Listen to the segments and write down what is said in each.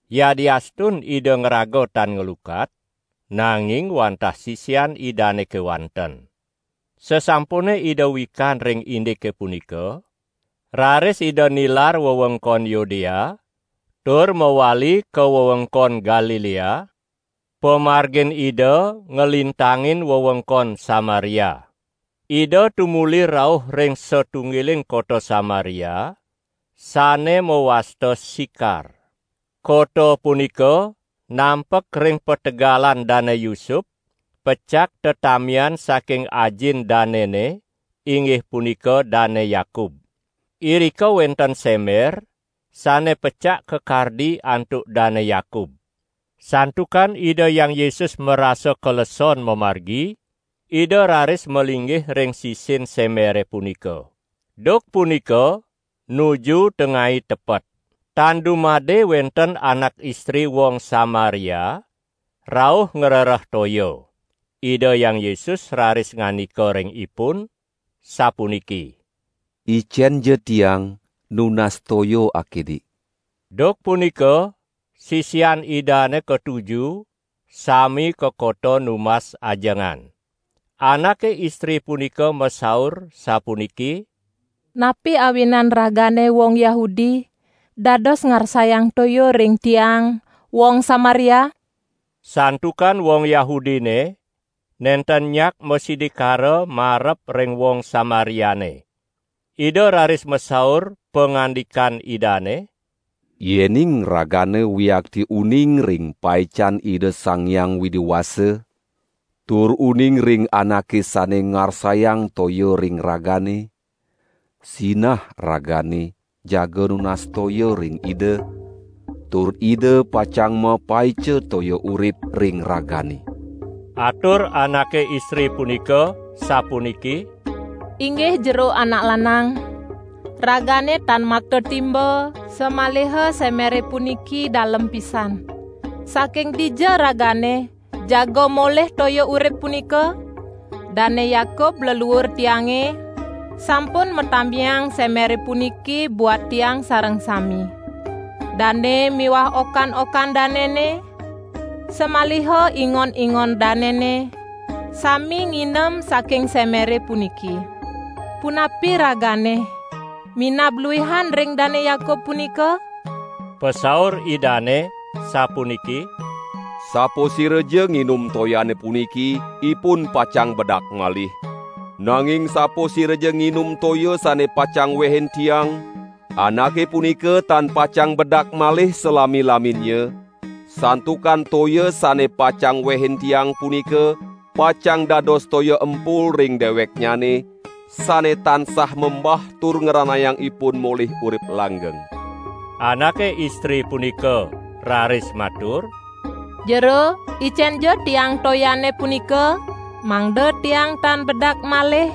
Yadiastun Ida ngraga tan nglukat, nanging wantah sisian Idane kewanten.) Sasampune Ida wikan ring indike punika, raris Ida nilar wewengkon Yudea tur mawali ka wewengkon Galilea; pamargin Ida nglintangin wewengkon Samaria. Ida tumuli rauh ring satunggiling kota Samaria, sane mawasta Sikar. Kota punika nampek ring pategalan Dane Yusup pecak tetamian saking ajin danene inggih punika Dane Yakub. Irika wenten semer, sane pecak kakardi antuk Dane Yakub. Santukan Ida Hyang Yesus marasa kaleson mamargi, Ida raris malinggih ring sisin semere punika. Duk punika nuju tengai tepet. Tan dumade wenten anak istri wong Samaria rauh ngrereh toya. Ida Hyang Yesus raris ngandika ring ipun, sapuniki: "Icenja Tiang nunas toya akidik!" ( Duk punika sisian Idane katuju sami ka kota numbas ajengan.) Anake istri punika masaur sapuniki: "Napi awinan ragane wong Yahudi dados ngarsayang toya ring tiang, wong Samaria?" (Santukan wong Yahudine nenten nyak masidikara marep ring wong Samariane.) Ida raris masaur, pangandikan Idane: "Yening ragane wiakti uning ring paican Ida Sang Hyang Widi Wasa tur uning ring Anake sane ngarsayang toya ring ragane, sinah ragane jaga nunas toya ring Ida, tur Ida pacang mapaica toya urip ring ragane." Atur anake istri punika sapuniki: "Inggih jero anak lanang, Ragane tan makta timba, samaliha semere punika dalem pisan. Saking dija ragane jaga molih toya urip punika? Dane Yakub leluur tiange sampun matamiang semere puniki buat tiang sareng sami. Dane miwah oka-okan danene, samaliha ingon-ingon danene sami nginem saking semere puniki. Punapi Ragane minab luihan ring Dane Yakub punika?" Pasaur Idane sapuniki: "Sapasiraja nginum toyane puniki ipun pacang bedak malih; nanging sapasiraja nginum toya sane pacang wehin Tiang, anake punika tan pacang bedak malih salami-laminnya, santukan toya sane pacang wehin Tiang punika, pacang dados toya empul ring deweknyane sane tansah membah tur ngranayang ipun molih urip langgeng!" Anake istri punika raris matur: "Jero, icenja tiang toyane punika, mangda tiang tan bedak malih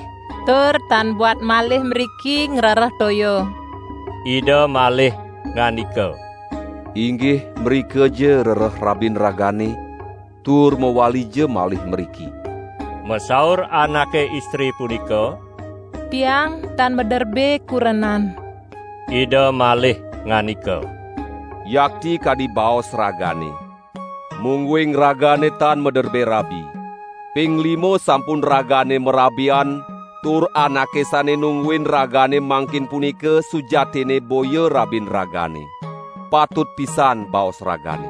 tur tan buat malih mriki ngrereh toya!" Ida malih ngandika: "Inggih mrikaja rereh rabin ragane, tur mawalija malih mriki!" Masaur anake istri punika: "Tiang tan maderbe kurenan!" Ida malih ngandika: "Yakti kadi baos ragane, mungguing ragane tan maderbe rabi. Ping lima sampun ragane marabian tur anake sane nungguin ragane mangkin punika sujatinne boya rabin ragane. Patut pisan baos ragane!"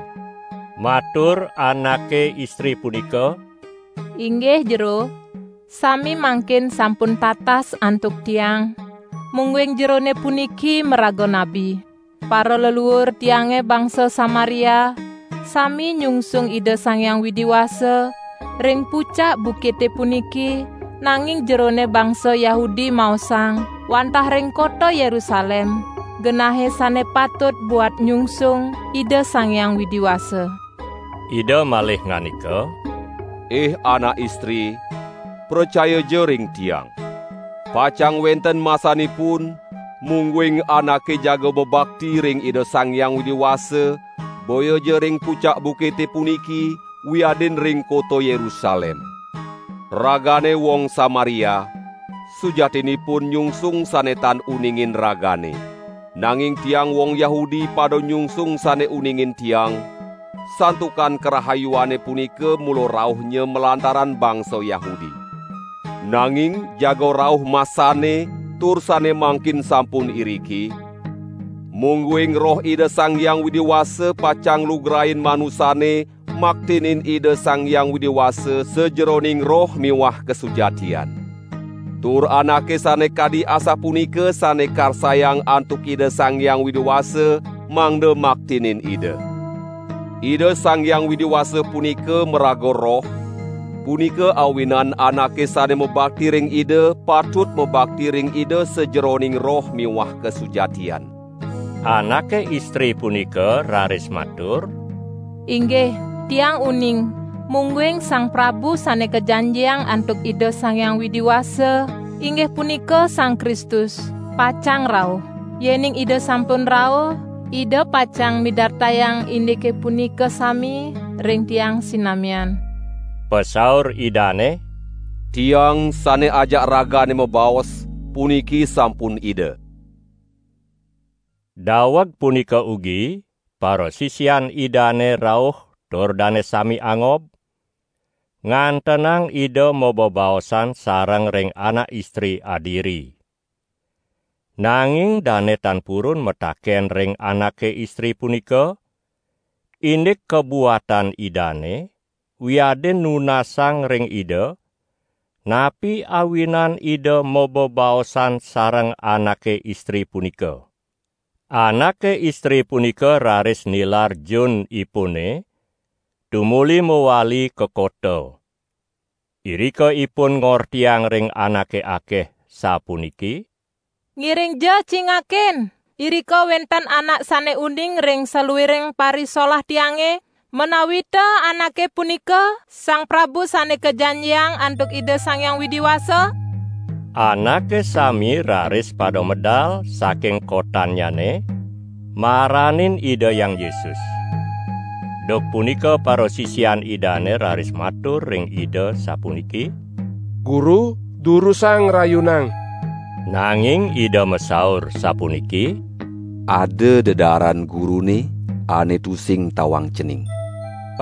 Matur anake istri punika: "Inggih Jero, sane mangkin sampun tatas antuk tiang, mungguing Jerone puniki maraga nabi! Paraleluur tiange bangsa Samaria sami nyungsung Ida Sang Hyang Widi Wasa ring pucak bukite puniki, nanging Jerone bangsa Yahudi maosang, wantah ring kota Yerusalem genahe sane patut buat nyungsung Ida Sang Hyang Widi Wasa." Ida malih ngandika: "Ih anak istri, pracayaja ring Tiang! Pacang wenten masanipun, mungguing anake jaga mabakti ring Ida Sang Hyang Widi Wasa boyaja ring pucak bukite puniki wiadin ring kota Yerusalem. Ragane wong Samaria, sujatinipun nyungsung sane tan uningin ragane; nanging Tiang wong Yahudi pada nyungsung sane uningin Tiang, santukan karahayuane punika mula rauhnya malantaran bangsa Yahudi. Nanging jaga rauh masanne tur sane mangkin sampun iriki: mungguing Roh Ida Sang Hyang Widi Wasa pacang nglugrain manusane maktinin Ida Sang Hyang Widi Wasa sajeroning roh miwah kasujatian. Tur anake sane kadi asapunika sane karsayang antuk Ida Sang Hyang Widi Wasa mangda maktinin Ida. Ida Sang Hyang Widi Wasa punika maraga Roh, punika awinan anake sane mabakti ring Ida patut mabakti ring Ida sajeroning roh miwah kasujatian." Anake istri punika raris matur: "Inggih, tiang uning, mungguing Sang Prabu Sane Kajanjiang antuk Ida Sang Hyang Widi Wasa, inggih punika Sang Kristus, pacang rauh. Yening Ida sampun rauh, Ida pacang midartayang indike punika sami ring tiang sinamian." Pasaur Idane: "Tiang, sane ajak ragane mabaos, puniki sampun Ida!" Daweg punika ugi parasisian Idane rauh tur dane sami angob, ngantenang Ida mabebaosan sareng ring anak istri adiri. Nanging dane tan purun mataken ring anake istri punika, indik kabuatan Idane, wiadin nunasang ring Ida, napi awinan Ida mabebaosan sareng anake istri punika. Anake istri punika raris nilar junipune tumuli mawali ka kota. Irika ipun ngortiang ring anake akeh sapuniki: "Ngiringja cingakin, irika wenten Anak sane uning ring saluiring parisolah tiange: menawita Anake punika Sang Prabu Sane Kajanjiang antuk Ida Sang Hyang Widi Wasa?" Anake sami raris pada medal saking kotannyane, maranin Ida Hyang Yesus. Duk punika parasisian Idane raris matur ring Ida sapuniki: "Guru, durusang ngrayunang!" Nanging Ida masaur sapuniki: "Ada dedaaran Gurune ane tusing tawang cening!"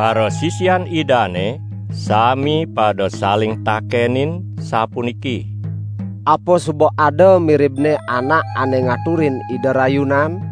Parasisian Idane sami pada saling takenin sapuniki: "Apa suba ada miribne anak ane ngaturin Ida rayunan?"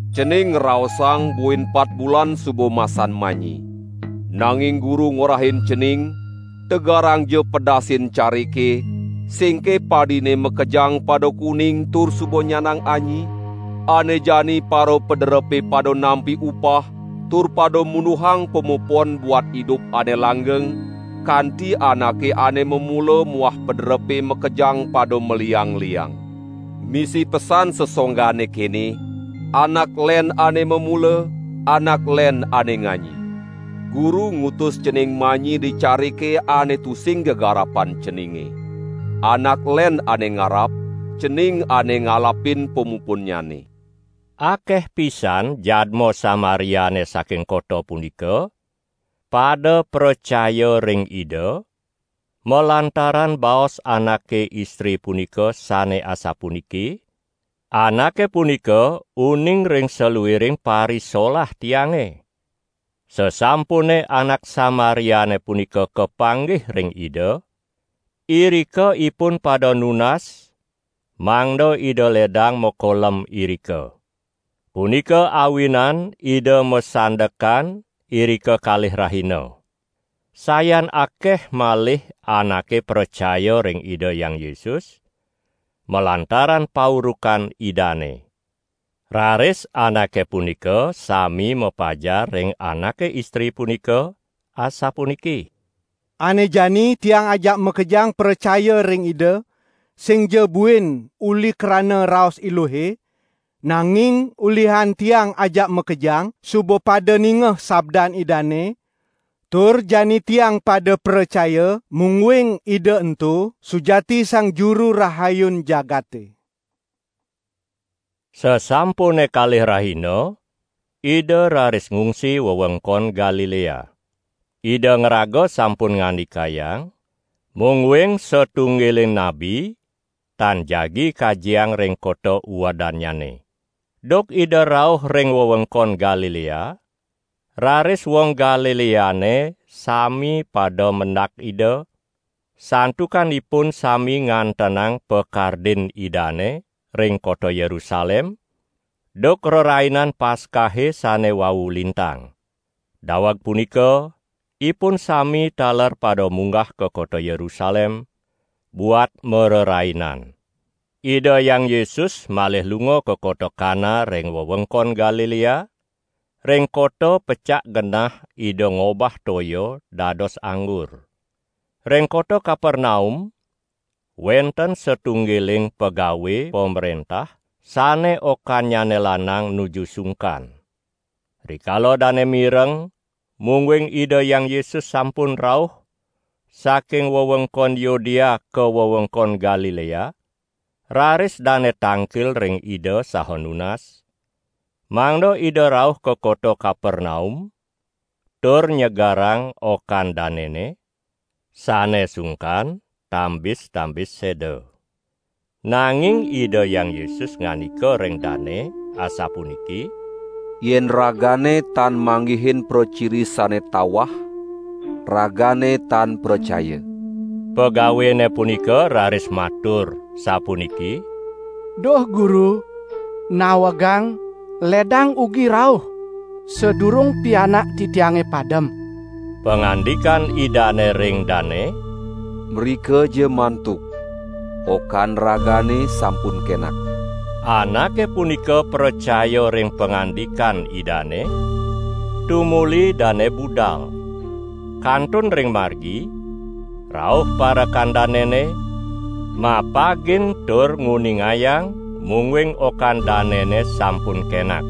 Cening ngraosang buin pat bulan suba masan manyi. Nanging Guru ngorahin cening: Tegarangja pedasin carike, singke padine makejang pada kuning tur suba nyandang anyi? Ane jani parapaderepe pada nampi upah tur pada munduhang pamupon buat idup ane langgeng, kanti anake ane mamula muah paderepe makejang pada maliang-liang. Misi pesan sangsonggane kene: Anak len ane mamula, anak len ane nganyi. Guru ngutus cening manyi di carike ane tusing gegarapan ceninge; anak len ane ngarap, cening ane ngalapin pamupunnyane." Akeh pisan jadma Samariane saking kota punika, pada pracaya ring Ida, malantaran baos anake istri punika sane asapuniki: "Anake punika uning ring saluiring parisolah tiange!" Sasampune anak Samariane punika kapanggih ring Ida, irika ipun pada nunas mangda Ida ledang makolem irika. Punika awinan Ida masandekan irika kalih rahina. Sayan akeh malih anake pracaya ring Ida Hyang Yesus malantaran paurukan Idane. Raris anake punika sami mapajar ring anake istri punika asapuniki: "Ane jani tiang ajak makejang pracaya ring Ida, singja buin uli krana raos eluhe, nanging ulihan tiang ajak makejang suba pada ningeh sabdan Idane, tur jani tiang pada pracaya, mungguing Ida ento sujati Sang Juru Rahayun jagate." Sasampune kalih rahina, Ida raris ngungsi wewengkon Galilea. Ida ngraga sampun ngandikayang, mungguing satunggiling nabi tan jagi kajiang ring kota uedannyane. Duk Ida rauh ring wewengkon Galilea, raris wong Galileane sami pada mendak Ida, santukan ipun sami ngantenang pakardin Idane ring kota Yerusalem duk Rerainan Paskahe sane wau lintang. Daweg punika ipun sami taler pada munggah ka kota Yerusalem buat marerainan. Ida Hyang Yesus malih lunga ka kota Kana ring wewengkon Galilea, ring kota pecak genah Ida ngobah toya dados anggur. Ring kota Kapernaum wenten satunggiling pegawe pamrentah sane okannyane lanang nuju sungkan. Rikala dane mireng mungguing Ida Hyang Yesus sampun rauh saking wewengkon Yudea ka wewengkon Galilea, raris dane tangkil ring Ida saha nunas, mangda Ida rauh ka kota Kapernaum tur nyegerang okan danene, sane sungkan tambis-tambis seda. Nanging Ida Hyang Yesus ngandika ring dane asapuniki: "Yen ragane tan manggihin praciri sane tawah, ragane tan pracaya." Pegawene punika raris matur sapuniki: "Duh Guru, nawegang ledang ugi rauh, sadurung pianak titiange padem!" Pangandikan Idane ring dane: "Mrikaja mantuk, okan ragane sampun kenak!" Anake punika pracaya ring pangandikan Idane, tumuli dane budal. Kantun ring margi, rauh parekan danene, mapagin tur nguningayang mungguing okan danene sampun kenak.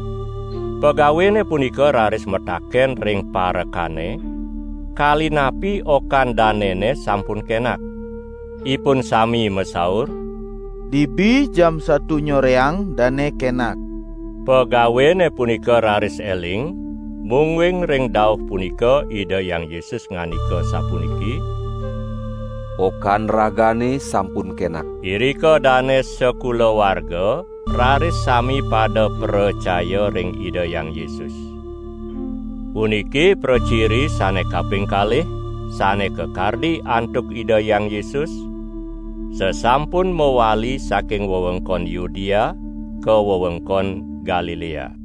Pegawene punika raris mataken ring parekane, kali napi okan danene sampun kenak. Ipun sami masaur: "Dibi jam satu nyoreang dane kenak!" Pegawene punika raris eling mungguing ring dauh punika Ida Hyang Yesus ngandika sapuniki: "Okan ragane sampun kenak!" Irika dane sakulawarga raris sami pada pracaya ring Ida Hyang Yesus. Puniki praciri sane kaping kalih sane kakardi antuk Ida Hyang Yesus sasampun mawali saking wewengkon Yudea ka wewengkon Galilea.